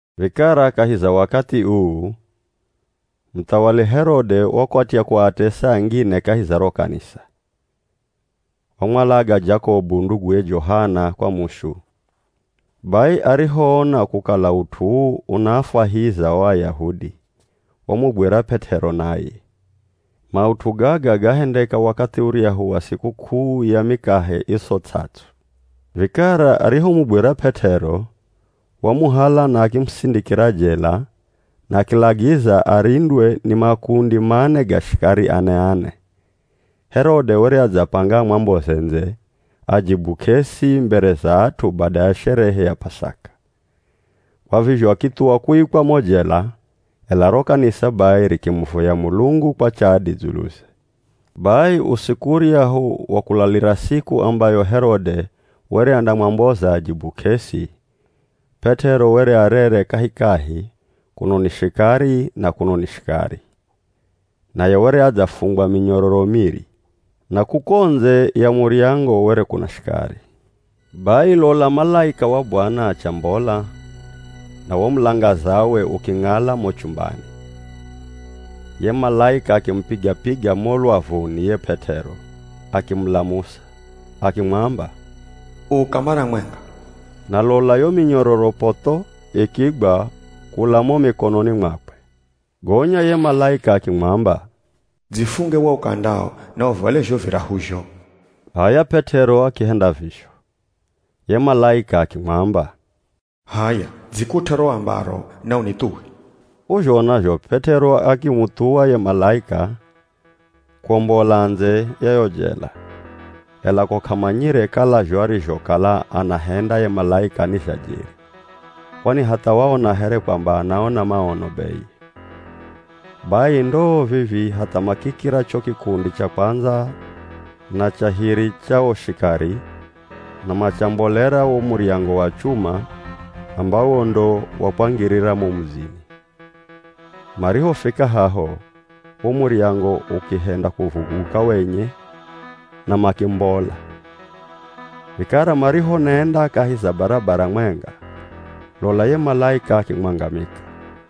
Vikara kahi za wakathi uu, muthawali Herode wakwatya kuatesa angine kahi za ro kanisa. Wamwalaga Jakobu nduguye Johana kwa mushu. Bai arihoona kukala ut'u uu unaafwahiza o Ayahudi, wamugwira P'et'ero naye. Maut'u gaga gahendeka wakathi uryahu wa sikuk'uu ya Mikahe Iso Ts'ats'u. Vikara arihomugwira P'et'ero, wamuhala na akimusindikira jela na akilagiza arindwe ni makundi mane ga shikari ane-ane. Herode were adzapanga amwamboze ndze ajibu k'esi mbere za at'u bada ya sherehe ya P'asaka. Kwa vizho akithuwa kuikwa mo jela, ela ro kanisa bai rikimuvoya Mulungu kwa chadi dzuluze. Bai usiku uryahu wa kulalira siku ambayo Herode were andamwamboza ajibu k'esi, P'et'ero were arere kahikahi, kuno ni shikari na kuno ni shikari. Naye were adzafungwa minyororo miri, na kuko ndze ya muryango were kuna shikari. Bai lola malaika wa Bwana achambola, na wo mulangazawe uking'ala mo chumbani. Ye malaika akimupiga-piga mo lwavuni ye P'et'ero akimulamusa. Akimwamba, “Uka mara mwenga!” Na lola yo minyororo potho, ikigwa kula mo mikononi mwakwe. Gonya ye malaika akimwamba, “Dzifunge wo ukandao na uvale zho virahuzho.” H'aya P'et'ero akihenda vizho. Ye malaika akimwamba, “H'aya dzikut'e ro ambaro na unithuwe.” K'uzhona zho P'et'ero akimuthuwa ye malaika kwombola ndze ya yo jela, ela ko k'amanyire kala zho arizhokala anahenda ye malaika ni zha jeri, kwani hatha waona here kwamba anaona maono beye. Bai ndoo vivii, hatha makikira cho kikundi cha kwandza na cha hiri cha o shikari na machambolera wo muryango wa chuma ambawo ndo wa kwangirira mo mudzini. Marihofika haho, wo muryango ukihenda kuvuguka wenye na makimbola. Vikara marihonenda kahi za barabara mwenga, lola ye malaika akimwangamika.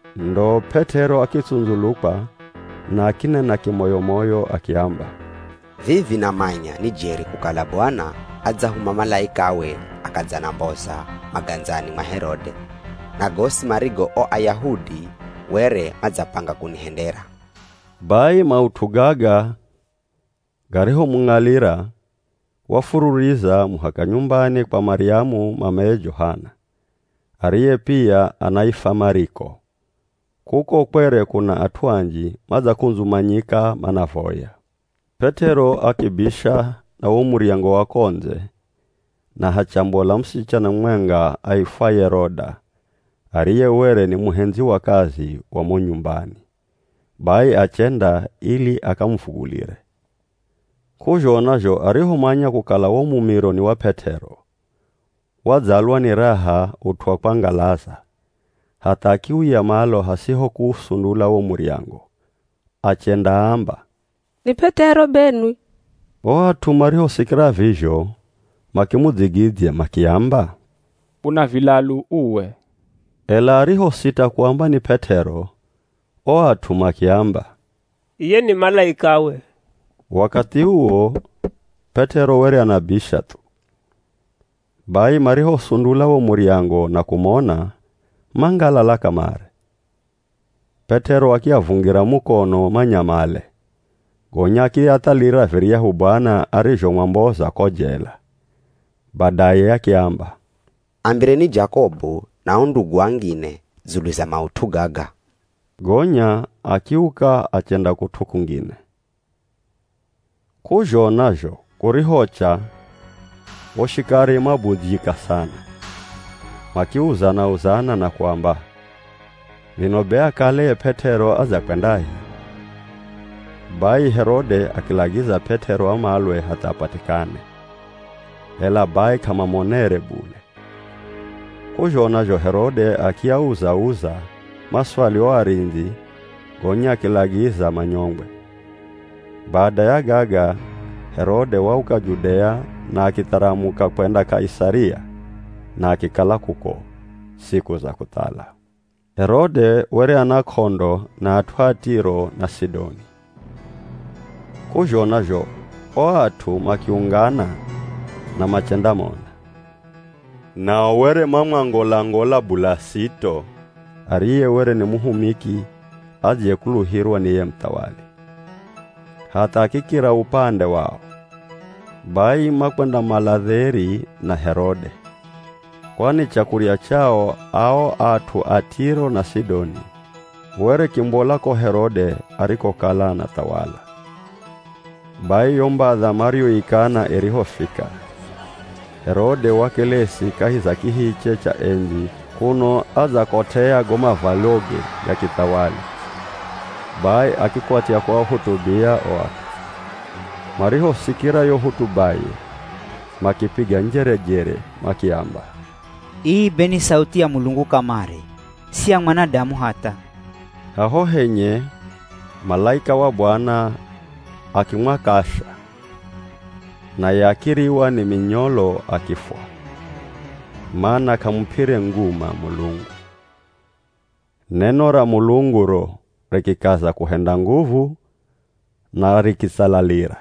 Ndo P'et'ero akitsundzulukwa na akinena kimoyo-moyo akiamba, “Vivi namanya ni jeri kukala Bwana adzahuma malaikawe akadzanamboza magandzani mwa Herode na gosi marigo o Ayahudi were madzapanga kunihendera.” Bai maut'u gaga garihomung'alira, wafururiza muhaka nyumbani kwa Maryamu mameye Johana, ariye pia anaifwa Mariko. Kuko kwere kuna at'u anji madzakundzumanyika manavoya. P'et'ero akibisha na wo muryango wa ko ndze, na hachambola musichana mumwenga aifwaye Roda ariye were ni muhendzi wa kazi wa mo nyumbani, bai achenda ili akamuvugulire. K'uzhona zho arihomanya kukala wo mumiro ni wa P'et'ero, wadzalwa ni raha ut'u wa kwangalaza hatha akiuya malo hasiho kuusundula wo muryango, achendaamba, “Ni P'et'ero benwi!” O at'u marihosikira vizho makimudzigidzya makiamba, “Una vilalu uwe.” Ela arihosita kuamba ni P'et'ero, o at'u makiamba, “Iye ni malaikawe.” Wakathi uwo P'et'ero were anabisha thu, bai marihosundula wo muryango na kumona, mangalala kamare. P'et'ero akiavungira mukono manyamale, gonya akiathalira viryahu Bwana arizhomwamboza ko jela. Badaye akiamba, “Ambireni Jakobu na o ndugu angine dzulu za maut'u gaga.” Gonya akiuka achenda kut'u kungine. K'uzhona zho kurihocha, o shikari mabudzyika sana. Makiuzana-uzana na kuamba, “Vino be akale ye P'et'ero adzakwendahi?” Bai Herode akilagiza P'et'ero amalwe hatha apatikane, ela bai k'amamonere bule. K'uzhona zho Herode akiauza-uza maswali o arindzi gonya akilagiza manyongwe. Bada ya gaga Herode wauka Judea na akitharamuka kwenda Kaisaria na akikala kuko siku za kuthala. Herode were ana k'ondo na at'u a Tiro na Sidoni. K'uzhona zho o at'u makiungana na machendamona. Nao were mamwangola-ngola Bulasito ariye were ni muhumiki adziyekuluhirwa ni ye muthawali, hatha akikira upande wao. Bai makwendamala dheri na Herode, kwani chakurya chao ao at'u a Tiro na Sidoni were kimbola ko Herode arikokala anathawala. Bai yo mbadha mariyoikana irihofika, Herode wakelesi kahi za kihiche cha endzi kuno adzakot'ea go mavwaloge ga kithawali, bai akikwatya kuahutubia o at'u. Marihosikira yo hotubaye, makipiga njerejere makiamba, “Ii be ni sauthi ya mulungu kamare, si ya mwanadamu hatha.” Haho henye malaika wa Bwana, akimwakasha, naye akiriwa ni minyolo akifwa, mana k'amup'ire nguma Mulungu. Neno ra Mulungu ro, rikikaza kuhenda nguvu na rikitsalalira.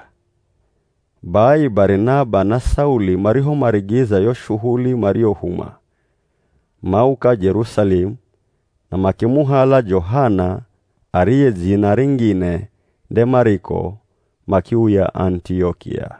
Bai Barinaba na Sauli marihomarigiza yo shuhuli mariyohumwa, mauka Jerusalemu na makimuhala Johana ariye dzina ringine nde Mariko makiuya Anitiokia.